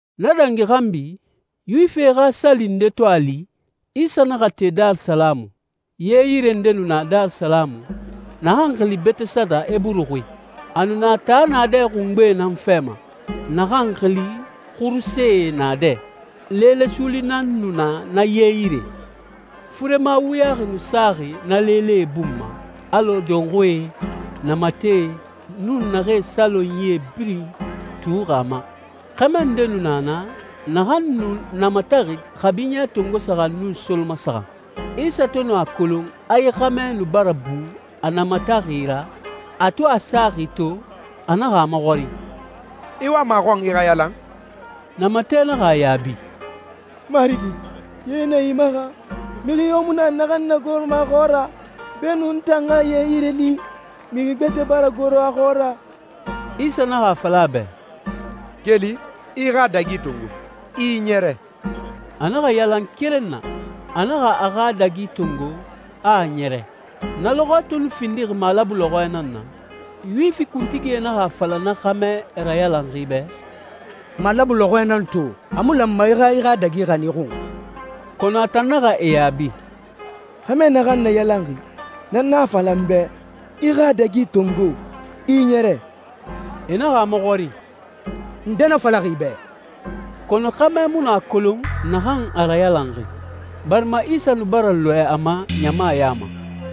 Na dangi xanbi, Yuwifie xa sali nde to a li, Isa naxa te Darisalamu. Ye yire nde nu na Darisalamu, naxan xili Beteseda Eburu xui. A nu na taa naadɛ xungbe nan fɛ ma, naxan xili Xurusee Naadɛ. Leele suuli nan nu na na ye yire. Furema wuyaxi nu saxi na leelee bun ma, alɔ dɔnxuie, namatɛe, nun naxee salonyie birin tuuxi a ma. Xɛmɛ nde nu na naa, naxan nu namataxi kabi ɲɛ tongo saxan nun solomasaxan. Isa to nu a kolon a yi xɛmɛ nu bara bu a namataxi ra, a to a saxi to, a naxa a maxɔrin, «I wama a xɔn i xa yalan?» Namatɛ naxa a yaabi, «Marigi, ye na imaxa, mixi yo mu na naxan n nagoroma a xɔɔra. Beenun n tan xa ye yire li, mixi gbɛtɛ bara goro a xɔɔra.» Isa naxa a fala a bɛ, «Keli, i i xa dagi tongo, i i ɲɛrɛ.» A naxa yalan keren na. A naxa a xa dagi tongo, a a ɲɛrɛ. Na lɔxɔɛ to nu findixi malabu lɔxɔɛ nan na, Yuwifi kuntigie naxa a fala na xɛmɛ rayalanxi bɛ, «Malabu lɔxɔɛ nan to, a mu lanma i xa i xa dagi xanin i xun.» Kɔnɔ a tan naxa e yaabi, «Xɛmɛ naxan n nayalanxi, na nan a fala n bɛ, ‹I i xa dagi tongo, i i ɲɛrɛ.›» E naxa a maxɔrin, «Nde na falaxi i bɛ?» Kɔnɔ xɛmɛ mu nu a kolon naxan a rayalanxi, barima Isa nu bara lɔɛ a ma ɲama ya ma.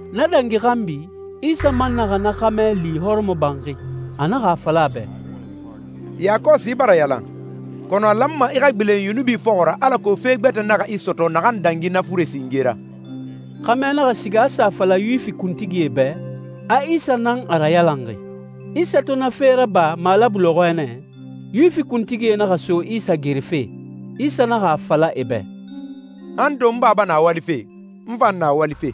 Na dangi xanbi, Isa man naxa na xɛmɛ li hɔrɔmɔbanxi, a naxa a fala a bɛ, «Yakɔsi i bara yalan, kɔnɔ a lanma i xa gbilen yunubi fɔxɔ ra alako fe gbɛtɛ naxa i sɔtɔ naxan dangi na fure singe ra.» Xɛmɛ naxa siga a sa a fala Yuwifi kuntigie bɛ, a Isa nan a rayalanxi. Isa to na fe raba malabu lɔxɔɛ nɛ, Yuwifi kuntigie naxa so Isa gerefe. Isa naxa a fala e bɛ, «Han to n Baba na walife, n fan na walife.»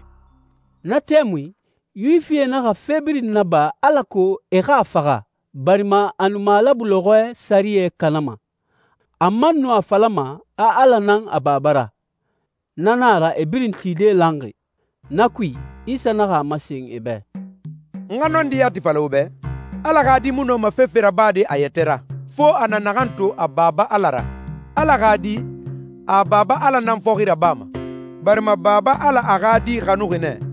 Na tɛmui, Yuwifie naxa fe birin naba alako e xa a faxa, barima a nu malabu lɔxɔɛ sɛriyɛ kanama, a man nu a falama a Ala nan a Baba ra. Na na a ra e birin tide lanxi. Na kui, Isa naxa a masen e bɛ, «N xa nɔndi yati fala wo bɛ, Ala xa Di mu nɔma fefe rabade a yɛtɛ ra, fo a na naxan to a Baba Ala ra. Ala xa Di, a Baba Ala nan fɔxi rabama. Barima Baba Ala a xa Di xanuxi nɛ,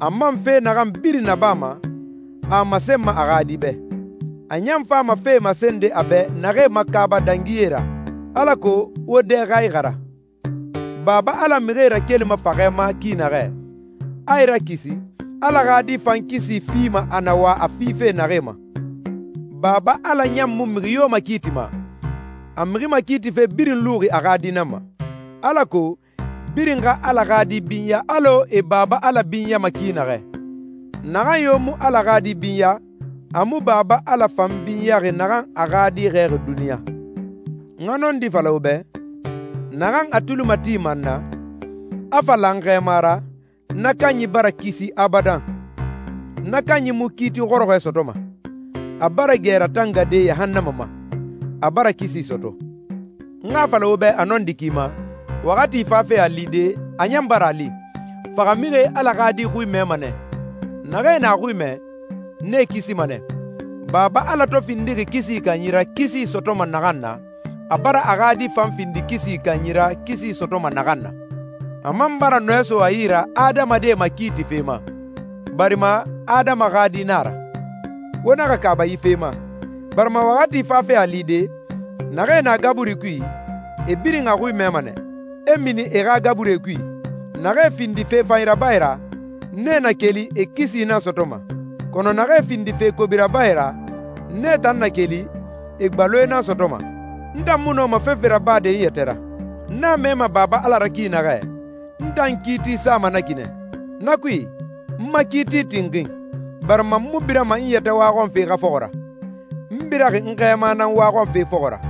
a man fe naxan birin nabama, a a masenma a xa Di bɛ. A ɲan fama fee masende a bɛ naxee makaaba dangi yee ra, alako wo dɛ xa ixara. Baba Ala mixie rakelima faxɛ ma ki naxɛ, a e rakisi, Ala xa Di fan kisi fima a na wa a fife naxee ma. Baba Ala ɲan mu mixi yo makiitima, a mixi makiitife birin luxi a xa Di nan ma, alako birin xa Ala xa Di binya alɔ e Baba Ala binyama ki naxɛ. Naxan yo mu Ala xa Di binya, a mu Baba Ala fan binyaxi naxan a xa Di xɛɛxi duniɲa.» «N xa nɔndi fala wo bɛ, naxan a tuli matima n na, a fa la n Xɛɛma ra, na kanyi bara kisi abadan. Na kanyi mu kiiti xɔrɔxɔɛ sɔtɔma, a bara gɛ ratangade yahannama ma, a bara kisi sɔtɔ. N xa a fala wo bɛ a nɔndi ki ma, waxati fafe a lide, a ɲan bara a li, faxamixie Ala xa Di xui mɛma nɛ. Naxee na a xui mɛ, nee kisima nɛ. Baba Ala to findixi kisi kanyi ra kisi sɔtɔma naxan na, a bara a xa Di fan findi kisi kanyi ra kisi sɔtɔma naxan na. A man bara nɔɛ so a yi ra adamadie makiitife ma, barima Adama xa Di nan a ra. Wo naxa kaaba yi fe ma, barima waxati fafe a lide, naxee na gaburi kui, e birin a xui mɛma nɛ, e mini e xa gaburie kui. Naxee findi fe fanyi rabae ra, nee na keli, e kisi nan sɔtɔma. Kɔnɔ naxee findi fe kobi rabae ra, nee tan na keli, e gbaloe nan sɔtɔma.» «N tan mu nɔma fefe rabade n yɛtɛ ra. N a mɛma Baba Ala ra ki naxɛ, n tan kiiti sama na ki nɛ. Na kui, n ma kiiti tinxin, barima n mu birama n yɛtɛ waxɔnfe xa fɔxɔ ra, n biraxi n Xɛɛma nan waxɔnfe fɔxɔ ra.»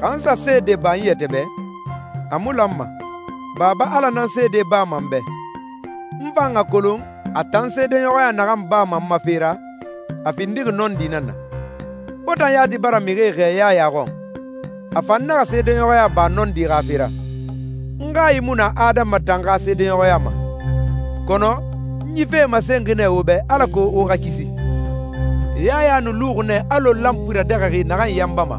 «Xa n sa seede ba n yɛtɛ bɛ, a mu lanma. Baba Ala nan seede bama n bɛ. N fan a kolon a tan seedeɲɔxɔya naxan bama n ma fe ra, a findixi nɔndi nan na. Wo tan yati bara mixie xɛɛ Yaya xɔn, a fan naxa seedeɲɔxɔya ba nɔndi xa fe ra. N hayi mu na adama tan xa seedeɲɔxɔya ma, kɔnɔ n yi fee masenxi nɛ wo bɛ alako wo xa kisi. Yaya nu luxi nɛ alɔ lanpui radɛxɛxi naxan yanbama.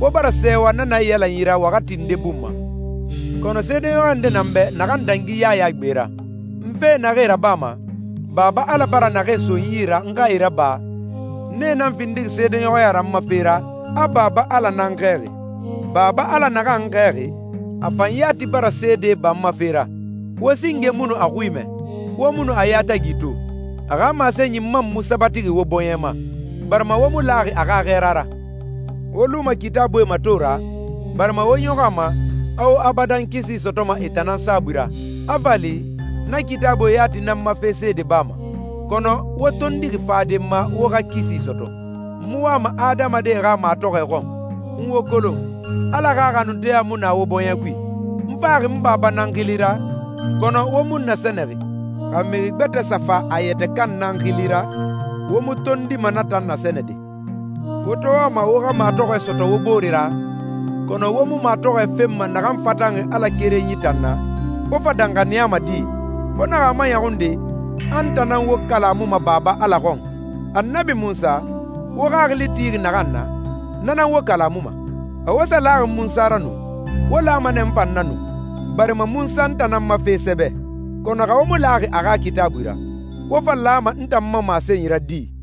Wo bara sɛɛwa na naiyalanyi ra waxati nde bun ma.» «Kɔnɔ seedeɲɔxɔya nde na n bɛ naxan dangi Yaya gbe ra. N fee naxee rabama, Baba Ala bara naxee so n yi n xa e raba, nee nan findixi seedeɲɔxɔya ra n ma fe ra, a Baba Ala nan n xɛɛxi. Baba Ala naxan n xɛɛxi, a fan yati bara seede ba n ma fe ra. Wo singe mu nu a xui mɛ, wo mu nu a yatagi to, a xa masenyi man mu sabatixi wo bɔɲɛ ma, barima wo mu laxi a xa xɛɛra ra. Wo luma Kitaabuie mato ra, barima wo ɲɔxɔ a ma, a wo abadan kisi sɔtɔma e tan nan saabui ra. A fa li, na Kitaabuie yati nan n ma fe seede bama, kɔnɔ wo tondixi fade n ma wo xa kisi sɔtɔ.» «N mu wama adamadie xa matɔxɔɛ xɔn. N wo kolon. Ala xa xanunteya mu na wo bɔɲɛ kui. N faxi n Baba nan xili ra, kɔnɔ wo mu n nasɛnɛxi. Xa mixi gbɛtɛ sa fa a yɛtɛ kan nan xili ra, wo mu tondima na tan nasɛnɛde. Wo to wama wo xa matɔxɔɛ sɔtɔ wo bore ra, kɔnɔ wo mu matɔxɔɛ fenma naxan fatanxi Ala Kerenyi tan na, wo fa danxaniyama di?» «Wo naxa a maɲɔxun de a n tan nan wo kalamuma Baba Ala xɔn. Annabi Munsa, wo xaxili tixi naxan na, na nan wo kalamuma. Xa wo sa laxi Munsa ra nu, wo lama nɛ n fan na nu, barima Munsa n tan nan ma fe sɛbɛ. Kɔnɔ xa wo mu laxi a xa Kitaabui ra, wo fa lama n tan ma masenyi ra di?»